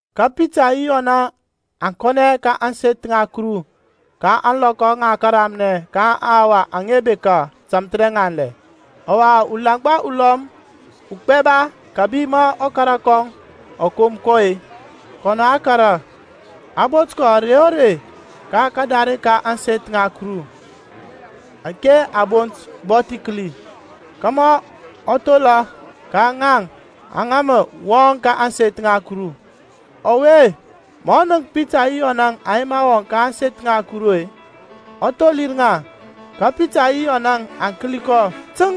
Ka Pitaŋ yi Yɔnȧŋ aŋ kȧnɛ ka ȧŋseth ŋa Kuru ka ȧŋlɔkɔ ŋa kəramnɛ ka aŋhawa aŋa bekȧ tȧmthərɛŋanlɛ. Ɔwa ulaŋgba ulɔm ugbɛba kȧbi ma ɔkara kɔŋ ɔ kom kɔ-e, kɔnɔ a kȧrȧ, a bot kɔ ȧrey o rey ka karare ka ȧŋseth ŋa Kuru ȧke a bont Bɔthikəli, kȧmȧ ɔ thola ka ŋaŋ aŋa mə wɔŋ ka ȧŋseth ŋa Kuru. Ɔwe-e, ma ɔ nənk Pitaŋ yi Yɔnȧŋ aŋ yema wɔŋ ka ȧŋseth ŋa Kuru-e, ɔ tholir ŋa. Ka Pitaŋ yi Yɔnȧŋ aŋ kəli kɔ təŋ,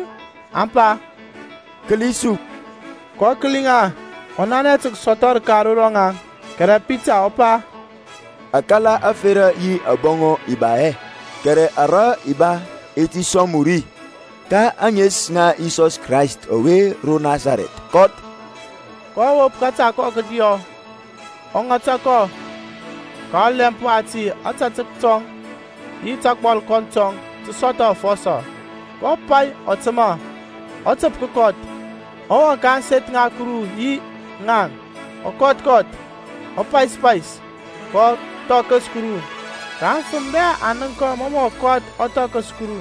aŋ pa, Kəli su. kɔ kəli ŋa, ɔ nanɛ tə kəsɔthɔ rəka ro rɔŋaŋ. Kɛrɛ Pitaŋ ɔ pa, Akala ȧferȧ yi abɔŋɔ i ba hɛ, kɛrɛ ara i ba i ti sɔŋ mu ri. Ka ȧŋes ŋa Yisɔs Krayst ɔwe ro Nasarɛth, kɔth. kɔ wop kȧta kɔŋ kədiɔ, ɔ ŋata kɔ; ka ɔlɛmp wati ȧtȧtək tɔŋ yi tagbɔlkɔnt tɔŋ tə sɔthɔ afɔsɔ. kɔ pay, ɔ təmȧ, ɔ təp kəkɔth, ɔ wɔŋ ka ȧŋseth ŋa Kuru yi ŋaŋ, ɔ kɔth kɔth, ɔ pais pais, ɔ thɔkəs Kuru. Ka aŋfəm bɛ aŋ nənk kɔ mɔ mɔ kɔth ɔ thɔkəs Kuru;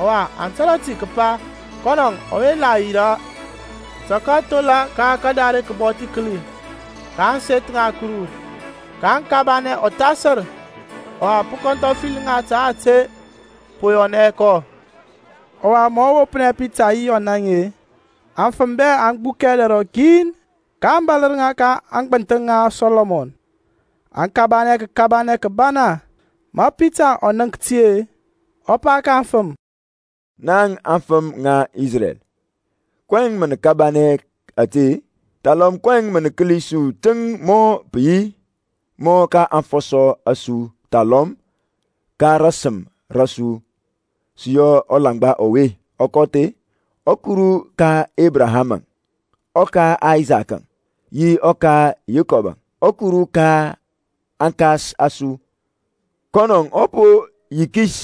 ɔwa aŋ tȧrȧ ti kəpa kɔnɔŋ ɔwe la yirȧ tə kəthola ka kadare kəBɔthikəli ka ȧŋseth ŋa Kuru, ka aŋ kabanɛ ɔthasər, ɔwa pə kɔnthɔfəli ŋa ta ȧte po yɔnɛ kɔ. Ɔwa ma ɔ wopnɛ Pitaŋ yi Yɔnȧŋ-e, aŋfəm bɛ aŋ gbukɛ dɛr rɔkin, kaŋ bȧlər ŋa ka aŋgbənthəŋ ŋa Sɔlɔmɔn, aŋ kabanɛ kəkabanɛ kəbana. Ma Pitaŋ ɔ ŋaŋk ti-e, ɔ pa ka aŋfəm, Naŋ afəm ŋa Isrɛl, kɔyɛŋ mə nə kabanɛ ȧte-e? Thalɔm kɔyɛŋ mə nə kəli su teŋ mɔ pə yi mɔ ka aŋfɔsɔ a su thalɔm ka rasəm ra su sə yɔ ɔlaŋgba ɔwe ɔ kɔth-e? ƆKuru ka Ebraham-əŋ, ɔka Aysakȧŋ yi ɔka Yekɔb-əŋ, ɔKuru ka aŋkas a su, kɔnɔ ɔ po yikis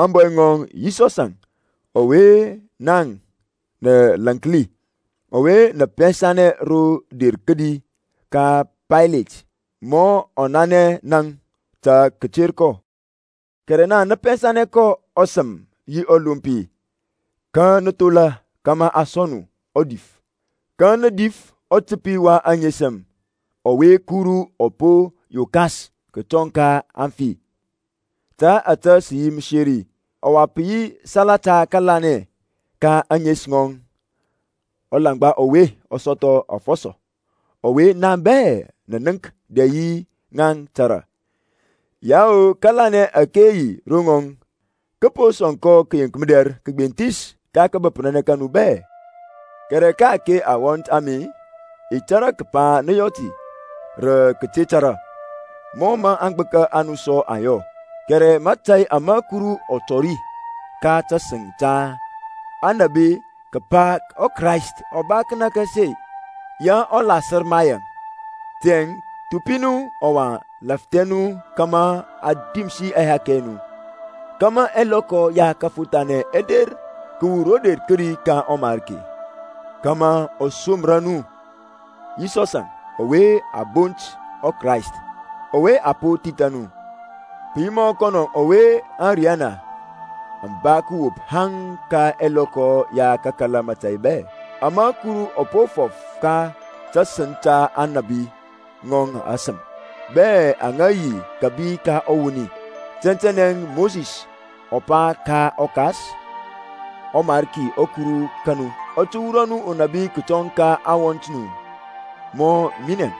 ȧŋbɔy ŋɔŋ Yisɔsȧŋ ɔwe naŋ nə lȧnki, ɔwa nə pɛnsa ro der kədi ka Paylet, ma ɔ nanɛ naŋ tə kəter kɔ. Kɛrɛ naŋ nə pɛnsa kɔn ɔSəm yi ɔLompi, ka nə thola kȧmȧ a sɔŋ nu udif. Ka nə dif ɔTəpi wa aŋesəm, ɔwe Kuru ɔ po yokas kətɔŋ ka aŋfi, ta ȧtȧ sə yi məseri. Ɔwa pə yi salata kəlanɛ ka ȧŋes ŋɔŋ ɔlanŋgba ɔwe ɔ sɔthɔ afɔsɔ, ɔwe naŋ bɛ nə nənk dɛ yi nə tȧrȧ. Yao, kȧlanɛ ȧke yi ro ŋɔŋ kə po sɔŋ kɔ kayenk mədɛr kəgbenthis ka kȧbəprȧnɛ ka nu bɛ. Kɛrɛ ka-ake awɔnt a mi i tȧrȧ kəpa nə yɔ ti rə kəte tȧrȧ, mɔ mə aŋgbəka a nu sɔ aŋ yɔ. Kɛrɛ mȧtȧy ama Kuru ɔ tɔri ka tasəŋ ta Aŋnȧbi kəpa ɔKrayst ɔ ba kənȧkȧsi-e, ya ɔ lasər ma yaŋ. Tiyȧŋ thupi nu ɔwa lafthɛ nu kȧmȧ a dimsi ɛhakɛ ɛ nu, kȧmȧ ɛlɔkɔ ya kəfothanɛ ɛ der kəwur ro der kədi ka ɔMarki; kȧmȧ ɔ somra nu Yisɔsȧŋ ɔwe a bont ɔKrayst, ɔwe a po thithȧ nu, pə yi mɔ kɔnɔ ɔwe ȧŋriyana aŋ ba kəwop haŋ ka ɛlɔkɔ ya kakala mȧtȧy bɛ, ama Kuru ɔ po fɔf ka tasəŋ ta Aŋnȧbi bi ŋɔŋ asəm bɛ aŋa yi kȧbi ka ɔwoni. Tɛntɛnɛ Mosis ɔ pa ka aŋkas, ƆMariki ɔKuru ka nu, ɔ tə wurɔ nu unabi kətɔŋ ka aŋwɔnt a nu mɔ minɛŋ.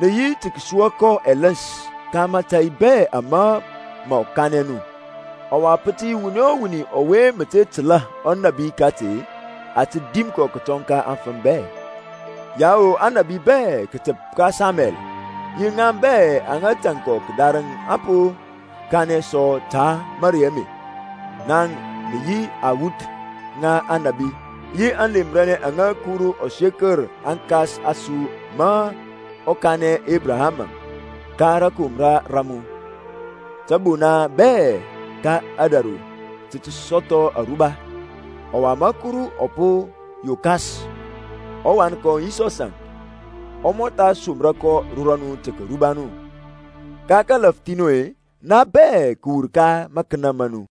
Nə yi tə kəsua kɔ ɛləns ka mȧtȧy bɛ ama mɔ kanɛ nu. Ɔwa pə tə yi wuni o wuni ɔwe mə te təlȧ ɔnȧbi kati-e, a tə dim kɔ kətɔŋ ka aŋfəm bɛ. Yao Aŋnȧbi bɛ, kətəp ka Samuɛl yi ŋaŋ bɛ aŋa tȧŋ kɔ kədarəŋ aŋ po kanɛ sɔ ta marey ame. Naŋ nə yi aŋwuth ŋa Aŋnȧbi, yi aŋlemranɛ aŋa Kuru ɔ sekər aŋkas a su ma ɔ kanɛ Ebrahamȧŋ, Ka rȧkomra ra mu, tȧbona bɛ ka ȧdȧru tə tə sɔthɔ aruba. Ɔwa ma Kuru ɔ po yokas ɔWan kɔŋ Yisɔsȧŋ, ɔ mɔtha somra kɔ ro rɔnu tə kəruba nu, ka kalafthi nu-e, naŋ bɛ kəwur ka makənə ma nu.